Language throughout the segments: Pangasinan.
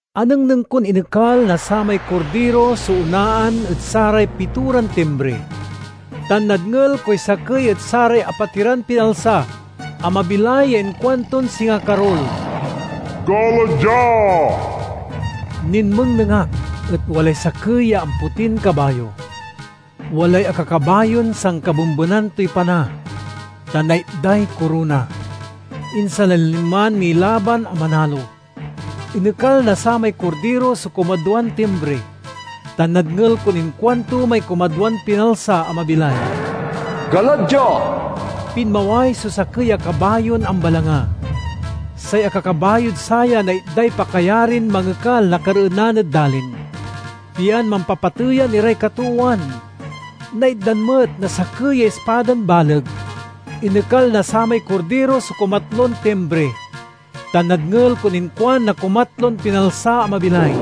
Anengneng kon inekal na samay Kordiro so onaan ed saray pitoran timbri, tan nadngel koy sakey ed saray apatiran pinalsa a mabilay ya inkuanton singa karul, "Gala dia!" Ninmengneng ak et walay sakey ya ampotin kabayo. Walay akakabayon sankabembenan toy pana, tan naitday korona. Insan la linman milaban a manalo. Inekal na samay Kordiro so kumadwan timbri, tan nadngel kon inkuanto may kumadwan pinalsa a mabilay, "Gala dia!" Pinmaway so sakey a kabayon ambalanga. Say akakabayod saya naitday pakayarin mangekal na kareenan ed dalin, pian mampapateyan iray katoowan. Naitdan met na sakey ya ispadan baleg. Inekal na samay Kordiro so kumatlon timbri, tan nadngel kon inkuan na kumatlon pinalsa a mabilay,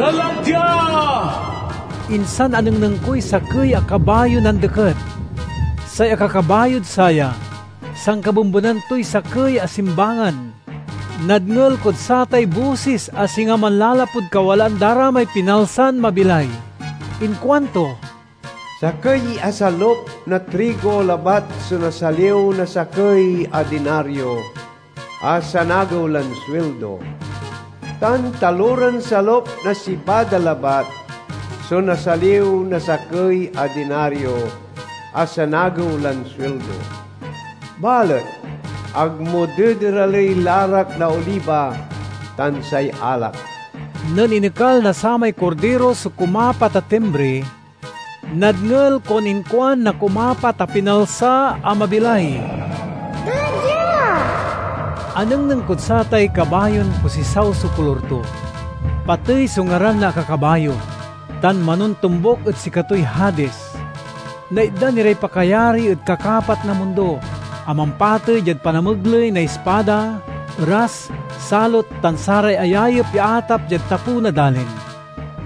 "Gala dia!" Insan anengneng koy sakey a kabayon andeket. Say akakabayod saya sankabembenan toy sakey a simbangan. Nadngel kod satay bosis a singa manlalapud kawalaan da ra may pinalsan mabilay. Inkuanto, "Sakey a salup na trigo labat so nasaliw na sakey a dinario a sanagew lan suildo, tan taloran salup na sibada labat so nasaliw na sakey a dinario a sanagew lan suildo. Balet ag mo dederaley larak na oliba tan say alak!" Nen inekal na samay Kordiro so kumapat a timbri, nadngel kon inkuan na kumapat a pinalsa a mabilay, "Gala dia!" Anengneng kod satay kabayon posisaw so kolor to. Patey so ngaran na akakabayo, tan manontombuk ed sikatoy Hadis. Naitdan iray pakayari ed kakapat na mundo, a mampatey diad panamegley na ispada, eras, salot, tan saray ayayep ya atap diad tapew na dalin.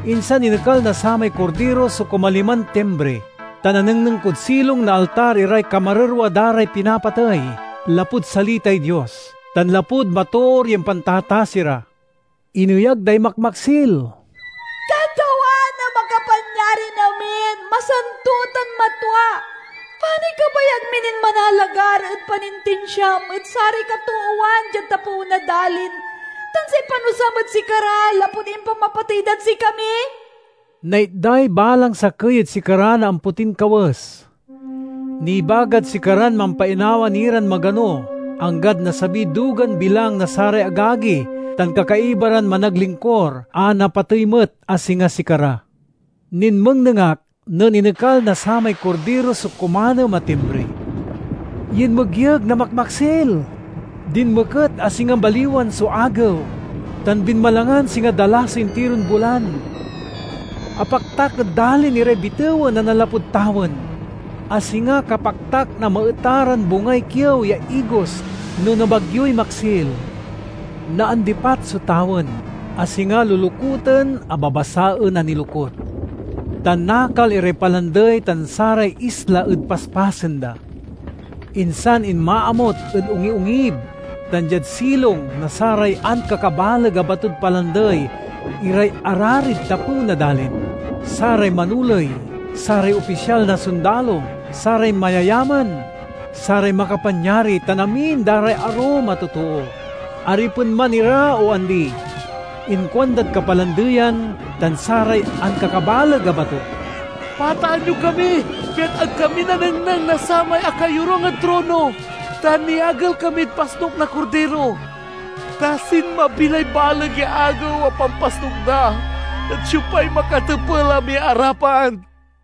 Insan inekal na samay Kordiro so kumaliman timbri, tan anengneng kod silong na altar iray kamarerwa da ray pinapatey, lapud salitay. Dios tan lapud matoor ya impantatasi ra. Ineyag day makmaksil, "Katawan a Makapanyarin-amin, masanto tan matwa! Panoy kabayag mi nin manalagar ed panintinsiam ed saray katoowan diad tapew na dalin tan say panusam ed sikara lapud impamapatey dad sikami?" Naitday balang sakey ed sikara na ampotin kawes. Nibagad sikaran mampainawa ni ran magano, anggad nasabiy dugan bilang na saray agagi tan kakaiba ran managlingkur a napatey met a singa sikara. Ninmengneng ak nen inekal na samay Kordiro so kumanem a timbri. Yinmegyeg na makmaksil, dinmeket a singa baliwan so agew, tan binmalangan singa dala so intiron bulan. Apaktak ed dalin iray bitewen a nanlapud tawen, a singa kapaktak na maeta ran bungay kiew ya igos no nabagyoy maksil. Naandipat so tawen, a singa lolokuten a babasaen a nilokut, tan nakal iray palandey tan saray isla ed paspasen da. Insan inmaamut ed ongiongib tan diad silong na saray ankakabaleg a batod palandey iray ararid tapew na dalin, saray manoley, saray opisyal na sondalo, saray mayayaman, saray makapanyari, tan amin da ray arum a totoo—aripen man ira o andi. Inkuandad kapalandeyan tan saray ankakabaleg a bato, "Pataan yo kami, pian ag kami nanengneng na samay akayorung ed trono, tan niagel kamid pasnuk na Kordiro! Ta sinmabi lay baleg ya agew a pampasnuk da, et siopay makatepel a miarapan?"